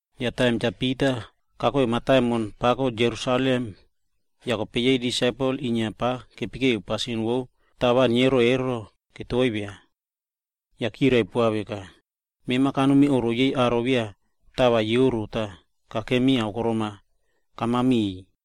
Yah taim Cha Pita kakoi mataimon pako Jerusalem, yah kope yei aro disaipel voro inia pava kepekeu pasin vo tava neoro ero, ketovia. Yah chirai poa veka, “Mema kanomi oꞌro yei aro voro beya tava keoro ero,a tah kakemi akorom-a kama miꞌiy.”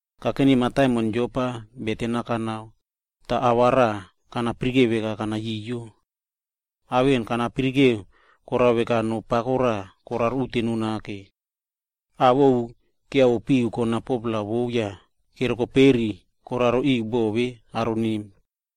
“Kakeni mataimon Jopa yah beten-a kanao, yah ao raꞌa kana yara veka bo kanayoyo. Ao vemona kana yara koraka aimino pako raꞌa koraro uteno nake. Ao ovu ketroro nao kona 4-pla vo yah kerereru koraro bo vemo karon emo.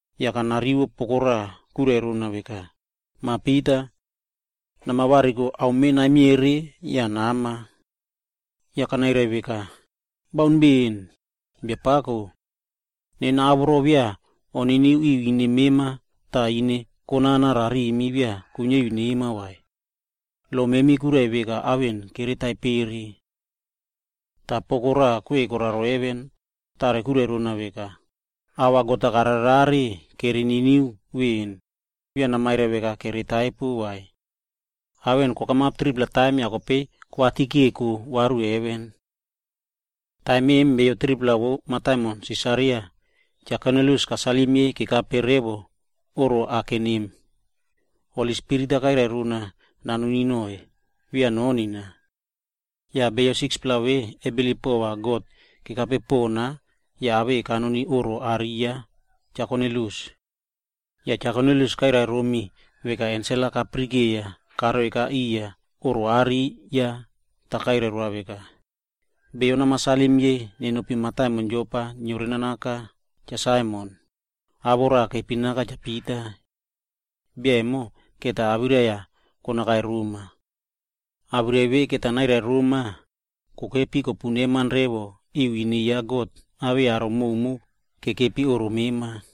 Yah kope kana rivo poko raꞌa kwirai rona veka, ‘Mah Pita! Nama variko, ame vemona namiere nere viri yah nama.’ “Yah kope nena kanairai veka, ‘Baun poaka, Biapako. Nena ao voro beya koniniu ri ine mema kana vai, tah ine konana rarimi beya kuiniari nema vai. Lo memi kwirai veka ao vemona kere taipere.’ “Toh kope poko raꞌa kwei koraro heven, tare kwirai rona veka, ‘Ao vemona God-a karare rare kere niniu veꞌeni, beya namairai veka ao vemo beya kere niniu vai.’ Ao vemona kokamap 3-pla taim yah kope kokoi varu heven. “Taim vemonamo, aro 3-pla vo mataimon Sisaria, Cha Kornilius kairai roiy kekape revo oꞌro vemona kaken emo. Holi Spirit-a kairai rona va nanoni noꞌoiy, beya nonina vai. Yah aro 6-pla vemona kebilip kekape pona yah kenomi oꞌro are ya Cha Kornilius. Yah Cha Kornilius kairai romi veka kayara ensel-a kararo karoi oꞌro are ya tah ava kairai roa veka, ‘Namairai moiy beyo nenopi mataimon Jopa yah neore naka Cha Saimon, awoꞌo ya raꞌa kepinaka Cha Pita. Bia emo va awirai-a konakai roma. Awirai vemonamo va nairai roma, kokepi kopu neman revo riya ine ya God awei aro koka voro kekepi oꞌro mema ero.’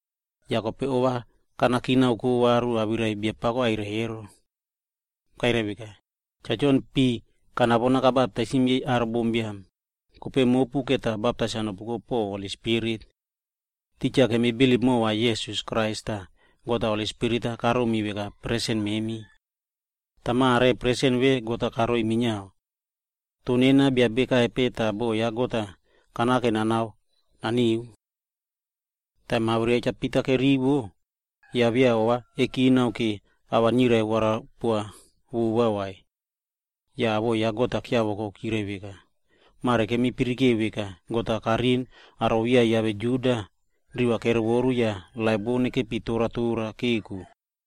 Yah kope ova kanakinako noꞌo varu awirai titja Biapako kairai emo. Kairai veka, ‘Cha Jon kabaptaisim yei aro bombiam ro pi kanapo, toh kope mopu va baptais-a nopuko po Holi Spirit.’ Titja kemi bilip mova Krais Jisas tah God-a Holi Spirit-a karomi veka presen. Yah kope mare presen vemo karoi minia aro vemona. Toh nena bia nape, tah boꞌo ya God-a kanake nanao naniu?” Taim awirai ya Cha Pita kerivo, yah beya ova kekinakina po ava nirai warapoa vai. Yah awoꞌo ya God pon kiavoko nake yah chirai veka, “Mare kemi yara veka, God-a karin aro voro beya kiave Juda minia, riva kerovoru yah laip vo nekepi tora tora keko.”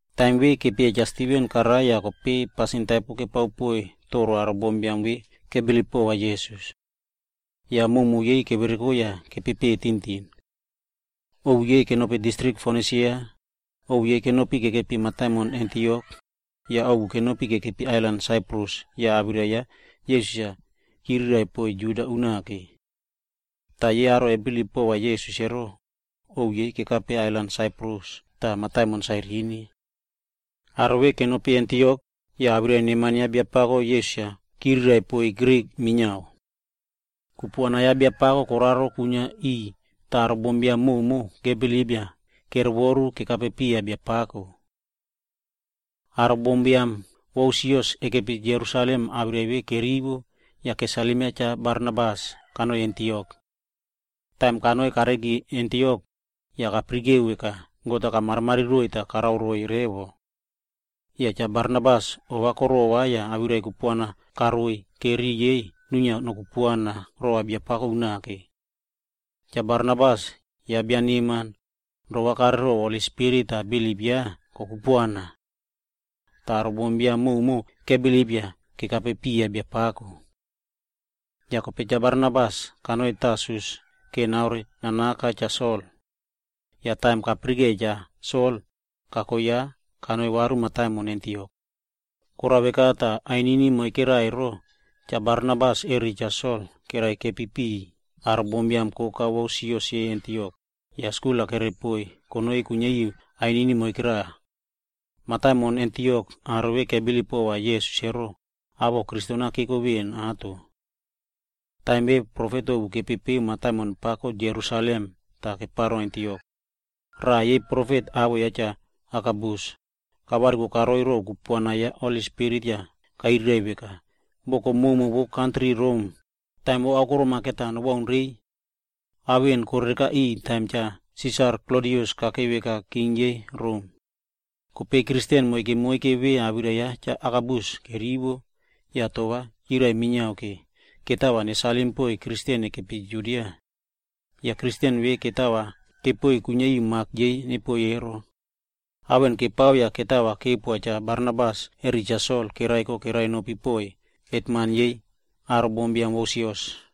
Taim vemona kepieya Cha Stiven karai yah kope pasin taipo kepao poiy aro bombiam vemona kebilip pova Jisas. Yake prumo yei kevereko yah kenopi tintin. Ovu yei kenopi distrik Fonisia, ovu kenopi kekepi mataimon Antiok, yah ovu kenopi kekepi ailan Saiprus yah awirai ya Jisas chiriraiꞌvo konoi roiy aro Juda pon. Toh kope yei aro ve kebilip pova Jisas emo, ovu yei kekape ailan Saiprus re mataimon Sairini. Aro vemona kenopi mataimon Antiok yah awirai neman ya Biapako Jisas-a chiriraiꞌvo poiy aro vo Grik minia. Yah kupuana ya Biapako koraro kwinia riꞌiy tah aro bombiam prumo kebilip yah kerovoruka piya Biapako. Aro bombiam vo sios kwinia Jerusalem awirai vemona kerivo, yah kope chirai poa Cha Barnabas kanoi Antiok. Yah taim kanoi kareiki Antiok, yah kayarai veka God-a kamarimari roiy tah karao roiy revo. Yah Cha Barnabas ova korova yah awirai kupuana kairai roiy vora riꞌi yei nuinia kupuana rova Biapako unake. Cha Barnabas, bia emo bia neman, rova kareu ro Holi Spirit tah kabilip rova revo Jisas. Yah aro bombiam koka kebilip yah kekape piya Biapako. Yah kope Cha Barnabas kanoi Tarsus vora naore naka Cha Sol. Yah taim kapirikeiya Cha Sol, kako ya kanoi varu mataimon Antiok. Yake Cha Barnabas re Cha Sol kerekepi piꞌiy aro bombiam koka vo sios yei Antiok, yah skul-a kere poiy konoi kuiniari revo ainini moike raꞌa. Yah aro vemona kebilip pova Jisas emo, awoꞌo Kristen-a keko titja nini vemo mataimon Antiok. Taim vemona aro profet ovu kepepeu mataimon pako Jerusalem yah kope keparo Antiok. Moike raꞌa yei profet, awoꞌo ya Cha Agabus, kavariko karoi yah ro kupuana vou Holi Spirit, kairai veka boko prumo vo Rom va taim vo akorom-a nobaun va norerekare riꞌiy. (Ao vemona korerekare riꞌiy taim ya Cha Klodius kope kakei king yei Rom.) Kope aro Kristen moike moike vemo, awirai ya Cha Agabus kerivo, tah chirai minia va mani koraꞌa nepoiy aro Kristen kekepi Judia. Yah aro Kristen vemo mani kepoi yaꞌai kuiniari mak yei nepoi ero. Ao vemona kepao yah kope mani kepoa Cha Barnabas re Cha Sol kereko kere nopi tah kere piꞌiy aro hetman vo sios.